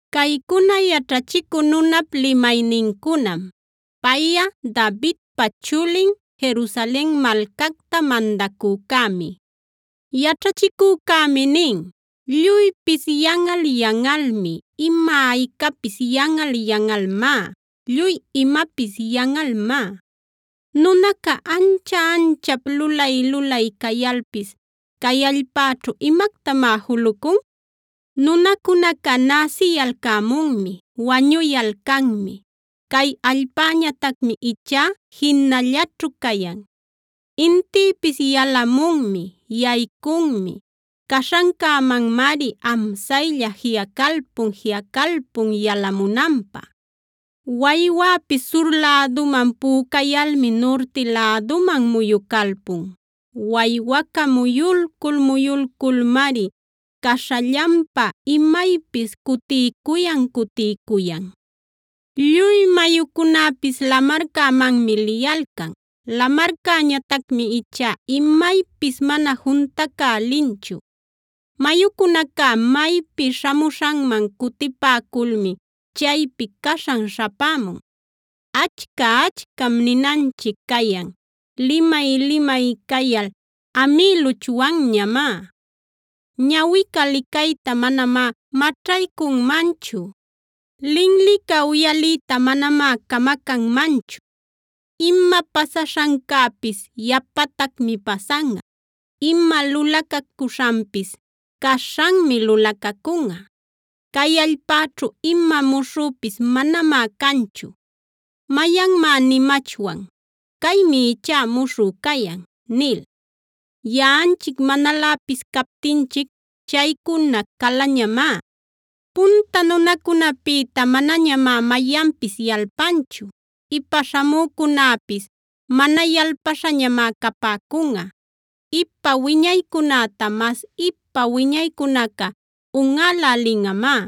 Caycuna yaćhachicü nunap limaynincunam; payꞌa Davidpa chulin, Jerusalen malcacta mandacücämi. Yaćhachicücämi nin: Lluypis yanꞌal-yanꞌalmi; ima-aycapis yanꞌal yanꞌalmá, lluy imapis yanꞌalmá. ¿Nunaca ancha-anchap lulay-lulay cayalpis cay allpäćhu imactamá julucun? Nunacunaca näsiyalcämunmi, wañuyalcanmi; cay allpäñatacmi ichá jinallaćhu cayan. Intïpis yalamunmi, yaycunmi; caśhancämanmari amsaylla jiꞌacalpun-jiꞌacalpun yalamunanpä. Waywäpis sur läduman pücayalmi nurti läduman muyucalpun; waywaca muyulcul-muyulculmari caśhallanpa imaypis cutiycuyan-cutiycuyan. Lluy mayucunäpis lamarcämanmi liyalcan. Lamarcäñatacmi ichá imaypis mana juntacälinchu. Mayucunaca maypi śhamuśhanman cutipäculmi chaypi caśhan śhapämun. Achca-achcam ninanchic cayan; limay-limay cayal amïluchwanñamá. Ñawica licayta manamá maćhaycunmanchu; linlica uyaliyta manamá camacanmanchu. Ima pasaśhancäpis yapatacmi pasanꞌa; ima lulacacuśhanpis caśhanmi lulacacunꞌa. Cay allpäćhu ima muśhüpis manamá canchu. ¿Mayanmá nimachwan: “Caymi ichá muśhü cayan” nil? Yaꞌanchic manaläpis captinchic chaycuna calañamá. Punta nunacunäpïta manañamá mayanpis yalpanchu; ipa śhamücunäpis mana yalpaśhañamá capäcunꞌa. Ipa wiñaycunäta mas ipa wiñaycunaca unꞌälälinꞌamá.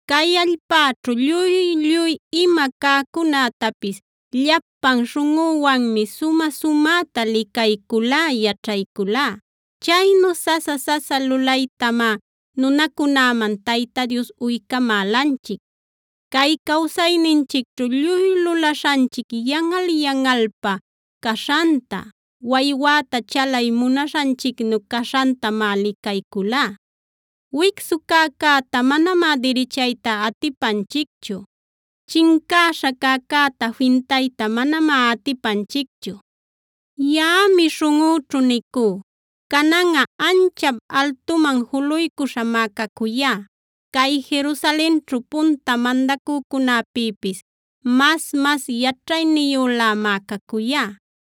Cay allpäćhu lluy-lluy ima cäcunätapis llapan śhunꞌüwanmi sumä-sumäta licayculá, yaćhayculá. Chaynu sasa-sasa lulaytamá nunacunäman Tayta Dios uycamälanchic. Cay cawsayninchicćhu lluy lulaśhanchic yanꞌal yanꞌalpä caśhanta, waywäta chalay munaśhanchicnu caśhantamá licayculá. Wicsu cäcäta manamá dirichayta atipanchicchu; chincäśha cäcäta fintayta manamá atipanchicchu. Yaꞌami śhunꞌüćhu nicú: “Cananꞌa anchap altuman juluycuśhamá cacuyá; cay Jerusalenćhu punta mandacücunäpïpis mas-mas yaćhayniyülämá cacuyá.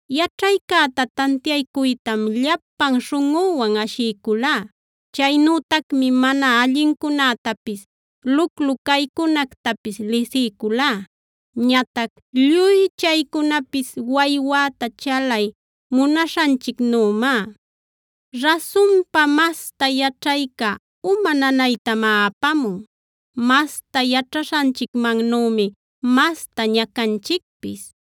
Yaćhaycäta tantiaycuytam llapan śhunꞌüwan ashiyculá; chaynütacmi mana allincunätapis, luclu caycunactapis lisiyculá. Ñatac lluy chaycunapis waywäta chalay munaśhanchicnümá. Rasunpa, masta yaćhayca uma nanaytamá apamun; masta yaćhaśhanchicmannümi masta ñacanchicpis.